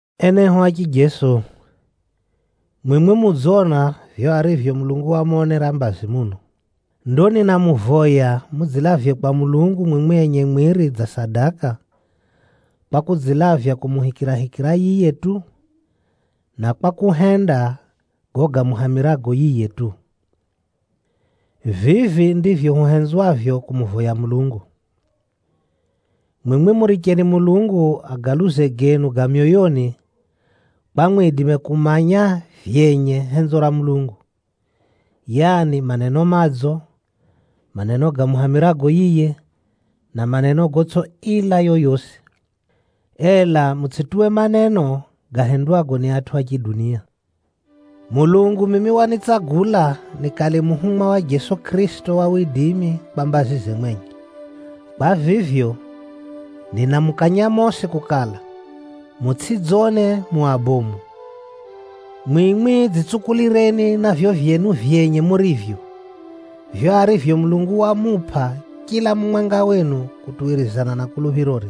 Enehu a chijeso, mwimwi mudzona vivyo arivyo Mulungu wamonera mbazi muno. Ndo ninamuvoya mudzilavye kwa Mulungu mwimwi enye mwiri dza sadaka, kwa kudzilavya kumuhumikira yiye tu, na kwa kuhenda gago gamuhamirago yiye tu. Vivi ndivyo huhenzwavyo kumuvoya Mulungu. Mwimwi muricheni Mulungu agaluze genu ga myoyoni, kwa mwidime kumanya vyenye henzo ra Mulungu, yaani maneno madzo, maneno gamuhamirago yiye, na maneno gotsʼi ila yoyosi. Ela mutsʼituwe maneno gahendwago ni atʼu a chidunia. Mulungu mimi wanitsagula nikale muhumwa wa Jeso Kʼirisito kwa mbazize mwenye. Kwa vivyo, ninamukanya mosi kukala, mutsʼidzone mu abomu. Mwimwi dzitsukulireni na vivyo vyenu vyenye murivyo, vivyo arivyo Mulungu wamupʼa chila mumwenga wenu kutuwirizana na kuluphirore.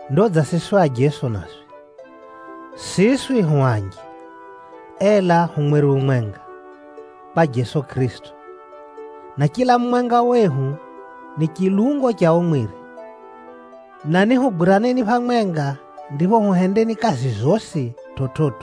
Ndo dza siswi ajeso naswi. Siswi hu anji, ela hu mwiri umwenga, kwa Jeso Kʼirisito. Na chila mumwenga wehu ni chilungo cha o mwiri, na nihugwiraneni phamwenga ndipho huhendeni kazi zosi chividzo.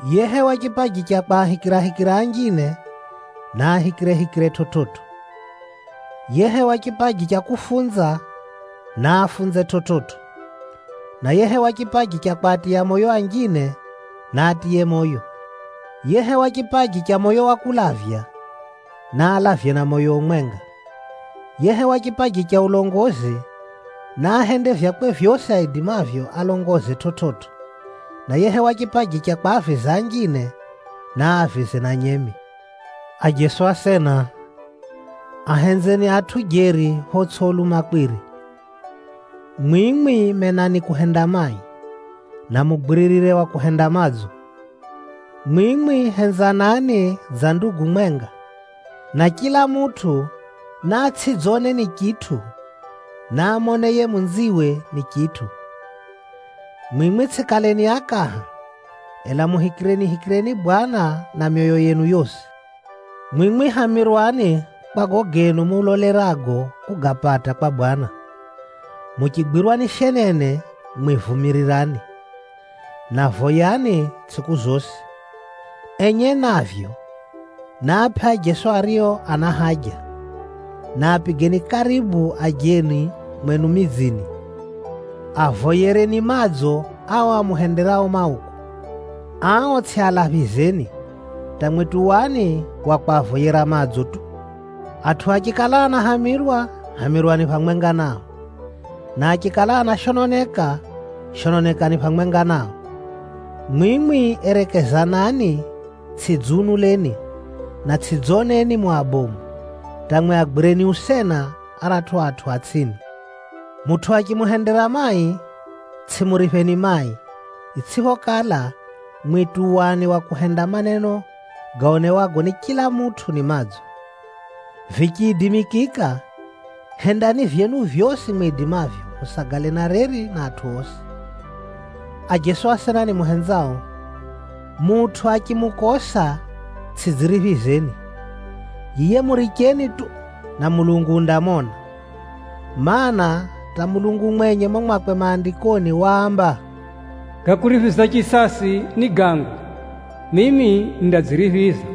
Yehewa chipaji cha kwahikirahikira anjine, naahikirehikire chividzo. Yehewa chipaji cha kufunza, naafunze chividzo. Na yehewa chipaji cha kwatiya moyo anjine, naatiye moyo. Yehewa chipaji cha moyo wa kulavya, naalavye na moyo umwenga. Yehewa chipaji cha ulongozi, naahende vyakwe vyosi aidimavyo alongoze chividzo, na yehewa chipaji cha kwaaviza anjine, naavize na nyemi. Ajeso asena, ahenzeni atʼu jeri photsʼi ulumakwiri. Mwimwi menani kuhenda mai, na mugwiririre wa kuhenda madzo. Mwimwi henzanani dza ndugu mwenga, na chila mutʼu naatsʼidzone ni chitʼu, naamone yiye munziwe ni chitʼu. Mwimwi tsʼikaleni akaha, ela muhikirenihikireni Bwana na myoyo yenu yosi. Mwimwi hamirwani kwa gago genu mulolerago kugapata kwa Bwana. Muchigwirwa ni shenene, mwi vumirirani, na voyani tsʼiku zosi. Enye navyo, naapʼe ajeso ario ana haja, na apigeni karibu ajeni mwenu midzini. Avoyereni madzo ao amuhenderao mauku. Ao tsʼialaphizeni, hata mwi tuwani wa kwavoyera madzo tu. Atʼu achikala anahamirwa, hamirwani phamwenga nao. Na achikala anashononeka, shononekani phamwenga nao. Mwimwi erekezanani, tsʼidziunuleni, na tsʼidzoneni mu abomu, hata mwi agwireni usena aratʼu atʼu a tsʼini. Mutʼu achimuhendera mai, tsʼimuripheni mai, itsʼiphokala, mwi tuwani wa kuhenda maneno gaonewago ni chila mutʼu ni madzo. Vichiidimikika, hendani vyenu vyosi mwidimavyo, musagale na reri na atʼu osi. Ajeso asena nimuhenzao, mutʼu achimukosa, tsʼidziriphizeni. Yiye muricheni tu, na Mulungu undamona. Maana, hata Mulungu mwenye mumo mwakwe Maandikoni waamba, “Ga kuriphiza chisasi ni gangu, mimi nindadziriphiza.”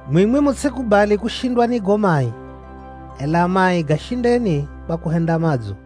Mwimwi mutsʼikubali kushindwa ni gago mai, ela mai gashindeni kwa kuhenda madzo.